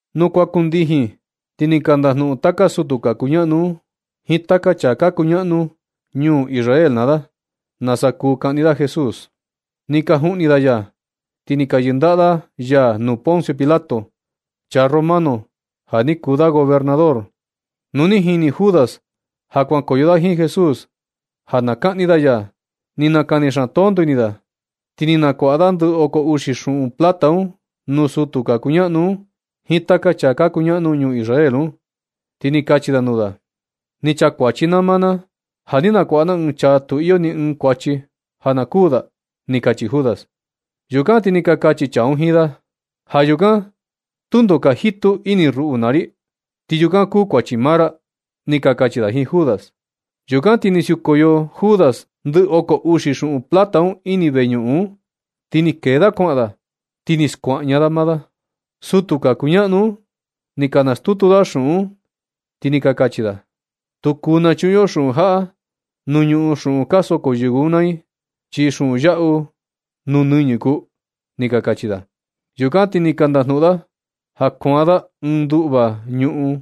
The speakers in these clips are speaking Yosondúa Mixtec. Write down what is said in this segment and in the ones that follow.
Nu kuan kundijin, ti ni ka ndajnuꞌun taka sutu ka kuñaꞌnu un jiin taka chaa ka kuñaꞌnu ñuu Israel naa da, nasa kuu kaꞌni da Jesús. Ni ka juꞌni da ya ti ni ka yɨndaꞌa da ya nuu Poncio Pilato, chaa romano ja ni kuu da gobernador. Nu ni jini Judas ja kuankoyo da jiin Jesús ja na kaꞌni da ya, ni nakani xaan tonto ini da. Ti ni nakuaꞌa da ndɨ oko uxi xuꞌun plata un nuu sutu ka kuñaꞌnu un jiin taka chaa ka kuñaꞌnu ñuu Israel un, ti ni kachi da nuu da: ―Ni chakuachi na maa na, ja ni nakuaꞌa na ɨɨn chaa tu ni iyo ni ɨɨn kuachi, ja na kuū da ―ni kachi Judas. Yukan ti ni ka kachi chaa un jiin da: ―Ja yukan, tundo ka jitu ini ruꞌu naa ri. Ti yukan kuu kuachi maa ra ―ni ka kachi da jiin Judas. Yukan ti ni siukoyo Judas ndɨ oko uxi xuꞌun plata un ini veñuꞌun un, ti ni kee da kuaꞌan da. Ti ni skuaꞌña da maa da. Sutu ka kuñaꞌnu un ni ka nastutu da xuꞌun un, ti ni ka kachi da: ―Tu kuu nachuꞌun yo xuꞌun jaꞌa nuu ñuꞌun xuꞌun ka soko yɨvɨ un naa i, chi xuꞌun yaꞌu nuu nɨñɨ kuu ―ni ka kachi da. Yukan ti ni ka ndajnuꞌun da ja kuan da ɨɨn nduꞌva ñuꞌun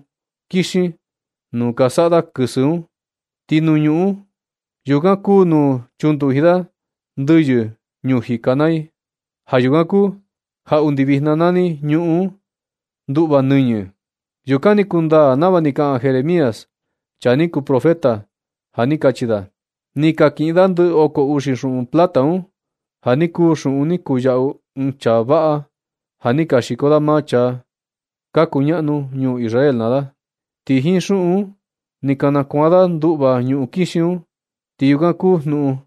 kixin nuu ka saꞌa da kɨsɨ un. Ti nuu ñuꞌun yukan kuu nuu chunduji da yɨvɨ ñuu jika naa i. Ja yukan kuu ja undi vijna nani ñuꞌun un nduꞌva nɨñɨ. Yukan ni kundaa nava ni kaꞌan Jeremías, chaa ni kuu profeta, ja ni kachi da: “Ni ka kiꞌin da ndɨ oko uxi xuꞌun plata un, ja ni kuu xuꞌun ni kuyaꞌu ɨɨn chaa vaꞌa ja ni ka xiko maa chaa ka kuñaꞌnu ñuu Israel naa da. Ti jiin xuꞌun un ni ka nakuan da nduꞌva ñuꞌun kixin un. Ti yukan kuu jnuꞌun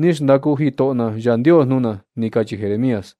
ni xndaku jitoꞌo na Yandios nuu na”, ni kachi Jeremías.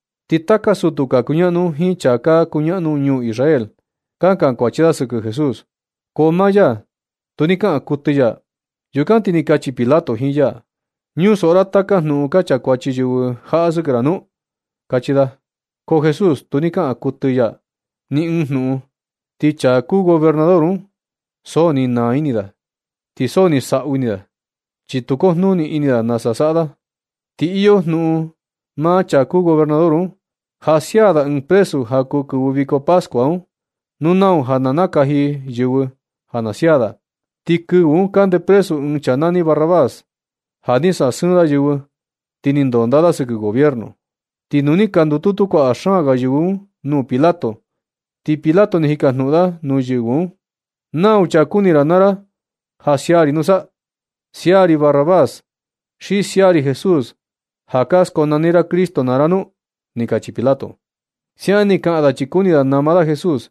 Ti taka sutu ka kuñaꞌnu un jiin chaa ka kuñaꞌnu ñuu Israel ka kankuachi da sɨkɨ Jesús, ko maa ya tu ni kaꞌan kuɨtɨ ya. Yukan ti ni kachi Pilato jiin ya: ―¿Ñusoꞌo ra taka jnuꞌun ka kankuachi yɨvɨ jaꞌa sɨkɨ ra nu? ―kachi da. Ko Jesús, tu ni kaꞌan kuɨtɨ ya ni ɨɨn jnuꞌun. Ti chaa kuu gobernador un, so ni naa ini da, ti so ni saꞌu ini da, chi tu kujnuni ini da nasa saꞌa da. Ti ni iyo jnuꞌun maa chaa kuu gobernador un, ja sia da ɨɨn presu ja kuu kɨvɨ viko pascua un, nuu nau ja na nakaji yɨvɨ ja na sia da. Ti kɨvɨ un kande presu ɨɨn chaa nani Barrabás, ja ni sasɨɨn da yɨvɨ, ti ni ndonda da sɨkɨ gobierno. Ti nu ni ka ndututu kuaꞌa xaan ga yɨvɨ un nuu Pilato, ti Pilato ni jikajnuꞌun da nuu yɨvɨ un: ―¿Nau chaa ka kuni ra naa ra ja na sia ri nusa? ¿Sia ri Barrabás, xi sia ri Jesús ja ka skonani ra Cristo naa ra nu? ―ni kachi Pilato. Siaꞌan ni kaꞌan da, chi kuni nama da Jesús,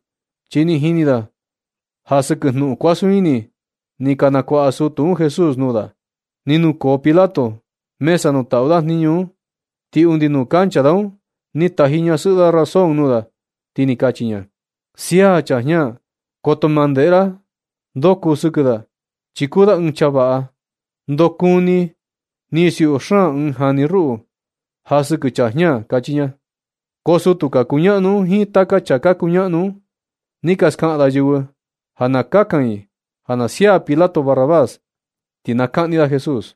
chi ni jini da ja sɨkɨ jnuꞌun kuasun ini ni ka nakuaꞌa sutu un Jesús nuu da. Ni nukoo Pilato mesa nuu taꞌu da jniñu un, ti undi nuu kancha da un ni taji ñasɨꞌɨ da razón nuu da, ni kachi ña: “Sia chaa jña. Koto ma ndeꞌe ra ndo kuu sɨkɨ da, chi kuu da ɨɨn chaa vaꞌa, ndo kúní ni siuꞌu xaan ɨɨn jani ruꞌu, ja sɨkɨ chaa jña”, kachi ña. Ko sutu ka kuñaꞌnu un jiin taka chaa ka kuñaꞌnu un, ni ka skaꞌan da yɨvɨ ja na kakan i ja na sia Pilato Barrabás, ti na kaꞌni da Jesús.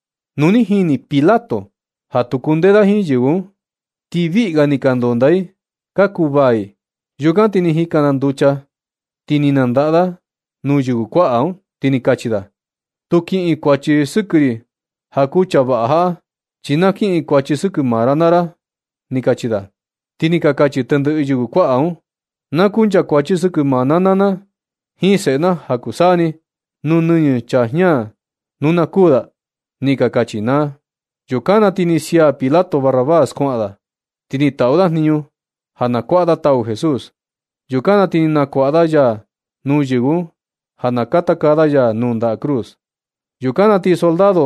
Nu ni jini Pilato ja tu kundee da jiin yɨvɨ un, chi viꞌi ga ni ka ndondaa i, ka kuvaa i, yukan ti ni jikan da nducha, ti ni nandaꞌa da nuu yɨvɨ kuaꞌa un, ti ni kachi da: ―Tu kiꞌin kuachi sɨkɨ ri ja kuu chaa vaꞌa jaꞌa, chi na kiꞌin kuachi sɨkɨ maa ra naa ra ―ni kachi da. Ti ni ka kachi tendɨꞌɨ yɨvɨ kuaꞌa un: ―Na kunchakuachi sɨkɨ maa na naa na jiin seꞌe na ja kuu saa ni, nuu nɨñɨ chaa jña nu na kuū da ―ni ka kachi naa. Yukan na ti ni sia Pilato Barrabás kuaꞌan da. Ti ni taꞌu da jniñu ja na kuaꞌa da tau Jesús. Yukan na ti ni nakuaꞌa da ya nuu yɨvɨ un ja, na katakaa da ya nuu nda cruz. Yukan na ti soldado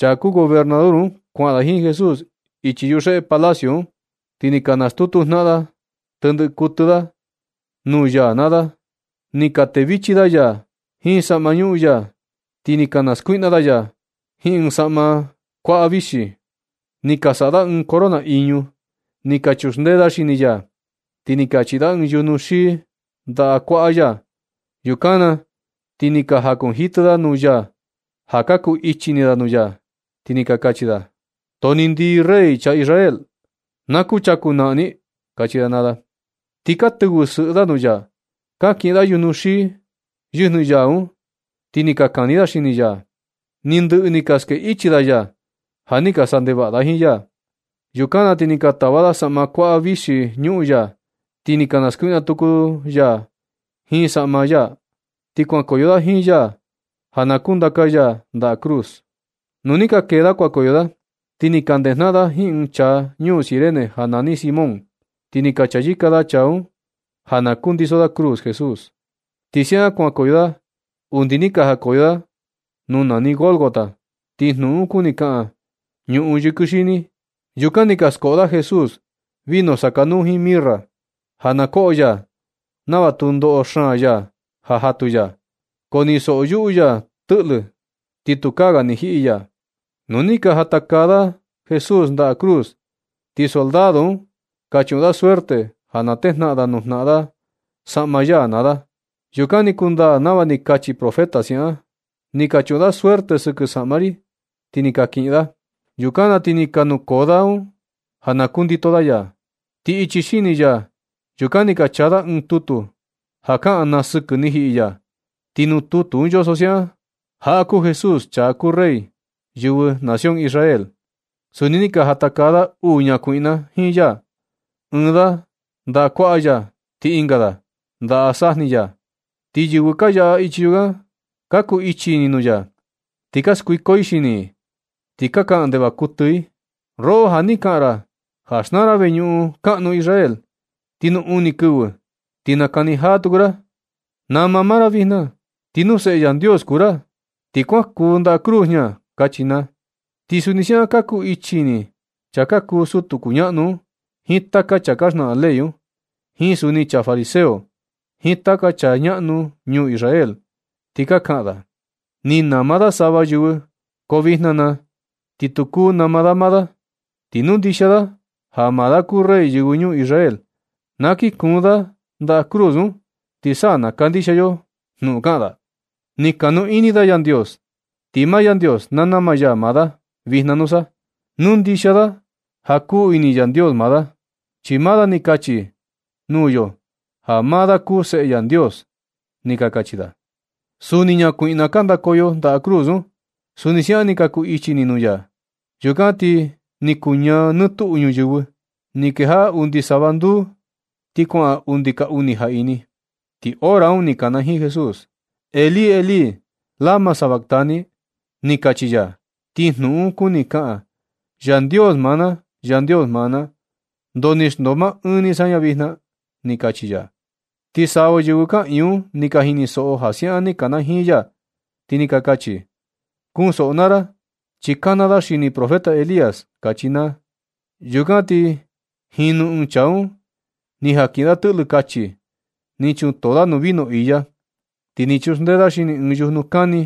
chaa kuu gobernador un kuaꞌan da jiin Jesús ichi yuxeꞌe palacio un, ti ni ka nastutu jnaꞌan tendɨꞌɨ kuɨtɨ da nuu ya naa da. Ni ka tevichi da ya jiin saꞌma ñuꞌun ya, ti ni ka naskuiꞌna da ya jiin ɨɨn saꞌma kuaꞌa vixi. Ni ka saꞌa da ɨɨn corona iñu, ni ka chuxndee da xini ya. Ti ni ka chiꞌi da ɨɨn yujnu xii ndaꞌa kuaꞌa ya. Yukan na ti ka jakunjitɨ da nuu ya ja ka kuu ichi ini da nuu ya, ti ni ka kachi da: ―Too ni ndii, Rey chaa Israel. Na kuchaku naꞌan ni ―kachi da naa da. Ti ka tɨvɨ sɨꞌɨ da nuu ya. Ka kiꞌin da yujnu xii yɨjnɨ ya un, ti ni ka kani da xini ya. Ni ndɨꞌɨ ni ka ske ichi da ya, ja ni ka saꞌa ndevaꞌa da jiin ya. Yukan na ti ni ka tava da saꞌma kuaꞌa vixi ñuꞌun ya, ti ni ka naskuiꞌna tuku da ya jiin saꞌma maa ya. Ti kuankoyo da jiin ya ja na kundaka ya ndaꞌa cruz. Nu ni ka kee da kuankoyo da, ti ni ka ndejnaꞌan da jiin ɨɨn chaa ñuu Cirene ja nani Simón, ti ni ka chayɨka da chaa un ja na kundiso da cruz Jesús. Ti siaꞌan kuankoyo da undi ni ka jakoyo da nuu nani Gólgota, ti jnuꞌun un kuni kaꞌan “ñuꞌun yɨkɨ xini.” Yukan ni ka skoꞌo da Jesús vino sakanuu jiin mirra, ja na koꞌo ya nava tu ndoꞌo xaan ya ja jatu ya. Ko ni soyuꞌu ya tɨꞌlɨ, ti tukaa ga ni jiꞌi ya. Nu ja ni ka jatakaa da Jesús ndaꞌa cruz, ti soldado un ni ka chuꞌun da suerte, ja na tejnaꞌan nuu jnaꞌan da saꞌma ya naa da. Yukan ni kundaa nava ni kachi profeta siaꞌan: “Ni ka chuꞌun da suerte sɨkɨ saꞌma ri, ti ni ka kiꞌin da.” Yukan na ti ni ka nukoo da un ja na kundito da ya. Ti ichi xini ya yukan ni ka chaa da ɨɨn tutu ja kaꞌan naa sɨkɨ ni jiꞌi ya. Ti nuu tutu un yoso siaꞌan: “Jaꞌa kuu Jesús, chaa kuu Rey yɨvɨ nación Israel.” Suni ni ka jatakaa da uu ñakuiꞌna jiin ya, ɨɨn da ndaꞌa kuaꞌa ya, ti ɨnga da ndaꞌa sajni ya. Ti yɨvɨ ka yaꞌa ichi yukan, ka ku ichi ini nuu ya, ti ka skuiko i xini i, ti ka kaꞌan ndevaꞌa kuɨtɨ i: ―Roꞌo ja ni kaꞌan ra ja xnaa ra veñuꞌun kaꞌnu Israel, ti nuu uni kɨvɨ ni ti nakani jaa tuku ra, nama maa ra vijna. Ti nu Seꞌe Yandios kuu ra, ti kuan kuun ndaꞌa cruz jña ―kachi naa. Ti suni siaꞌan ka cu ichi ini chaa ka kuu sutu kuñaꞌnu un, jiin taka chaa ka xnaꞌan ley un, jiin suni chaa fariseo, jiin taka chaa ñaꞌnu ñuu Israel un, ti ka kaꞌan da: ―Ni nama da sava yɨvɨ ko vijna na, ti tu kuu nama da maa da. Ti nu ndixia da ja maa da kuu Rey yɨvɨ ñuu Israel, na kii kuun da ndaꞌa cruz un, ti sa na kandixia yo jnuꞌun kaꞌan da. Ni kuu kanu ini da Yandios. Ti maa Yandios na nama ya maa da vijna nusa, nu ndixia da ja kuu ini Yandios maa da. Chi maa da ni kachi da nuu yo ja maa da kuu Seꞌe Yandios ―ni ka kachi da. Suni ñakuiꞌna ka ndakoyo ndaꞌa cruz un, suni siaꞌan ni ka ku ichi ini nuu ya. Yukan ti ni kuñaa nɨ tuꞌu ñuyɨvɨ, ni kejaꞌa undi sava nduu, ti kuaꞌan undi ka uni jaꞌini. Ti hora un ni kanajiin Jesús: ―Elí, Elí, ¿lama sabactani? ―ni kachi ya. Ti jnuꞌun un kuni kaꞌan: “Yandios maa na, Yandios maa na, ¿ndoo ni xndoo maa ɨɨn ni saña vijna”? ―ni kachi ya. Ti sava yɨvɨ kaꞌiin un ni ka jinisoꞌo ja siaꞌan ni kanajiin ya, ti ni ka kachi: ―Kunsoꞌo naa ra, chi kana da xini profeta Elías ―kachi naa. Yukan ti jinu ɨɨn chaa un ni jan kiꞌin da tɨꞌlɨ kachi, ni chuntoo da nuu vino iya, ti ni chuxndee da xini ɨɨn yujnu kani,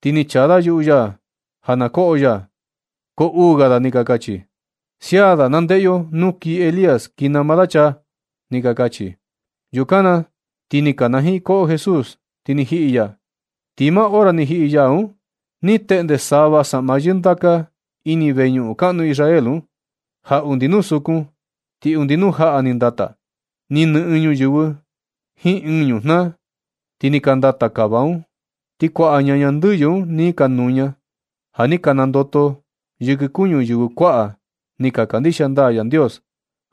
ti ni chaa da yuꞌu ya ja na koꞌo ya. Ko uu ga da ni ka kachi: ―Sia da, na ndeꞌe yo nu kii Elías kii nama da chaa ―ni ka kachi. Yukan na ti ni kanajiin koꞌo Jesús, ti ni jiꞌi ya. Ti maa hora ni jiꞌi ya un, ni teꞌnde sava saꞌma yɨndaka ini veñuꞌun kaꞌnu Israel un. Ja undi nuu sukun, ti undi nuu jaꞌa ni ndata. Ni nɨꞌɨn ñuyɨvɨ jiin ɨɨn ñujnaa. Ti ni ka ndata kava un. Ti kuaꞌa ñaña ndɨyɨ un ni ka nuña, ja ni ka nandoto yɨkɨ kuñu yɨvɨ kuaꞌa ni ka kandixia ndaa Yandios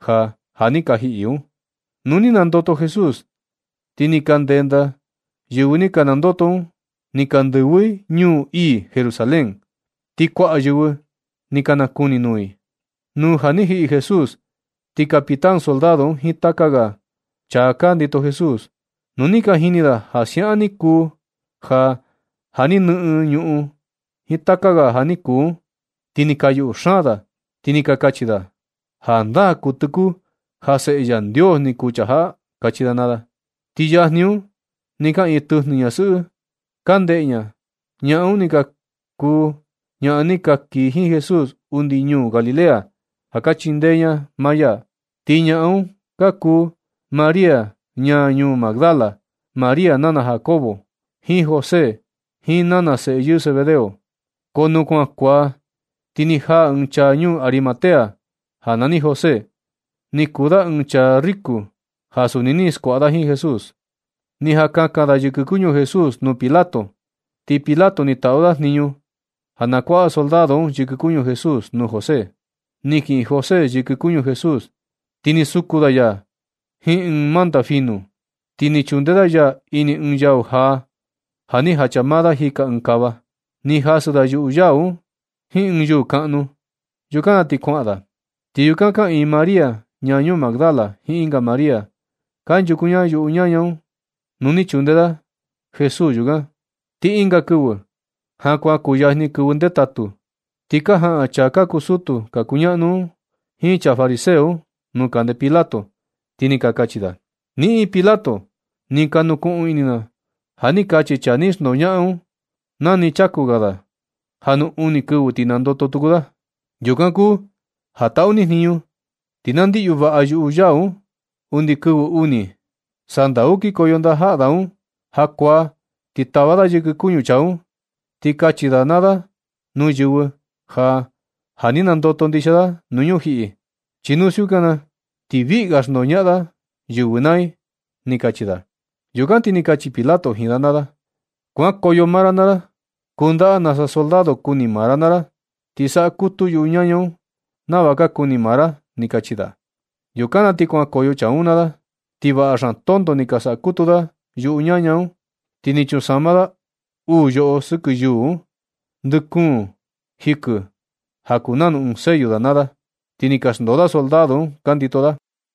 ja ja ni ka jiꞌi un. Nu ni nandoto Jesús, ti ni ka ndenda yɨvɨ ni ka nandoto un, ni ka ndɨvɨ i ñuu ii Jerusalén, ti kuaꞌa yɨvɨ ni ka nakuni nuu i. Nu ja ni jiꞌi Jesús, ti capitán soldado un jiin taka ga da ja chaa ka ndito Jesús, nu ni ka jini da ja siaꞌan ni kuu ja, ja ni nɨꞌɨn ñuꞌun jiin taka ga ja ni kuu un, ti ni ka yuꞌu xaan da, ti ni ka kachi da: ―Jandaa kuɨtɨ kuu ja Seꞌe Yandios ni kuu chaa jaꞌa ―kachi da naa da. Ti yajni un, ni kaꞌiin tɨjnɨ ñasɨꞌɨ, ka ndeꞌe ña, ñaꞌan un ni ka kuu ñaꞌan ni ka kii jiin Jesús undi ñuu Galilea, ja ka chindee ña maa ya. Ti ñaꞌan un ka kuu María ñaa ñuu Magdala, María nana Jacobo jiin José, jiin nana seꞌe yɨɨ Zebedeo. Nu kuan kuaa, ti ni jaa ɨɨn chaa ñuu Arimatea nani José, ni kuu da ɨɨn chaa riko ja suni ni skuaꞌa da jiin Jesús. Ni jan kakan da yɨkɨ kuñu Jesús nuu Pilato. Ti Pilato ni taꞌu da jniñu ja na kuaꞌa soldado un yɨkɨ kuñu Jesús nuu José. Ni kiꞌin José yɨkɨ kuñu Jesús, ti ni suku da ya jiin ɨɨn manta finu, ti ni chunde da ya ini ɨɨn yau jaa, ja ni jacha maa da jika ɨɨn kava. Ni jasɨ da yuꞌu yau un jiin ɨɨn yuu kaꞌnu. Yukan na ti kuaꞌan da. Ti yukan kaꞌiin María ñaa ñuu Magdala jiin ɨnga María, kanchuku ña yuꞌu ñana nuu ni chunde da Jesús yukan. Ti ɨnga kɨvɨ, ja kuan kuyajni kɨvɨ ndetatu, ti ka jaꞌan chaa ka kuu sutu ka kuñaꞌnu un, jiin chaa fariseo nuu kande Pilato, ti ni ka kachi da: ―Niꞌin Pilato, ni ka nukuꞌun ini na ja ni kachi chaa ni xndoñaꞌan un, na ni chaku ga da, ja nu uni kɨvɨ ti nandoto tuku da. Yukan kuu ja taꞌu ni jniñu, ti na ndiꞌyu vaꞌa yuꞌu yau un undi kɨvɨ uni. Sandau kinkoyo ndajaꞌa da un jakuaa, ti tava da yɨkɨ kuñu chaa un, ti kachi da naa da nuu yɨvɨ ja, ja ni nandoto ndixia da nuu ñujiꞌi. Chi nu siukan na, ti viꞌi ga xndoñaꞌan da yɨvɨ naa i ―ni kachi da. Yukan ti ni kachi Pilato jiin da naa da: ―Kuankoyo maa ra naa ra, kundaꞌa nasa soldado kuni maa ra naa ra. Ti saꞌa kutu yuꞌu ñaña un nava ka kuni maa ra ―ni kachi da. Yukan na ti kuankoyo chaa un naa da, ti vaꞌa xaan tonto ni ka sakutu da yuꞌu ñaña un. Ti ni chunsama da uu yoꞌo sɨkɨ yuu un, ndɨ kuun jikɨ ja kuu nanu ɨɨn sello da naa da. Ti ni ka xndoo da soldado un ka ndito da.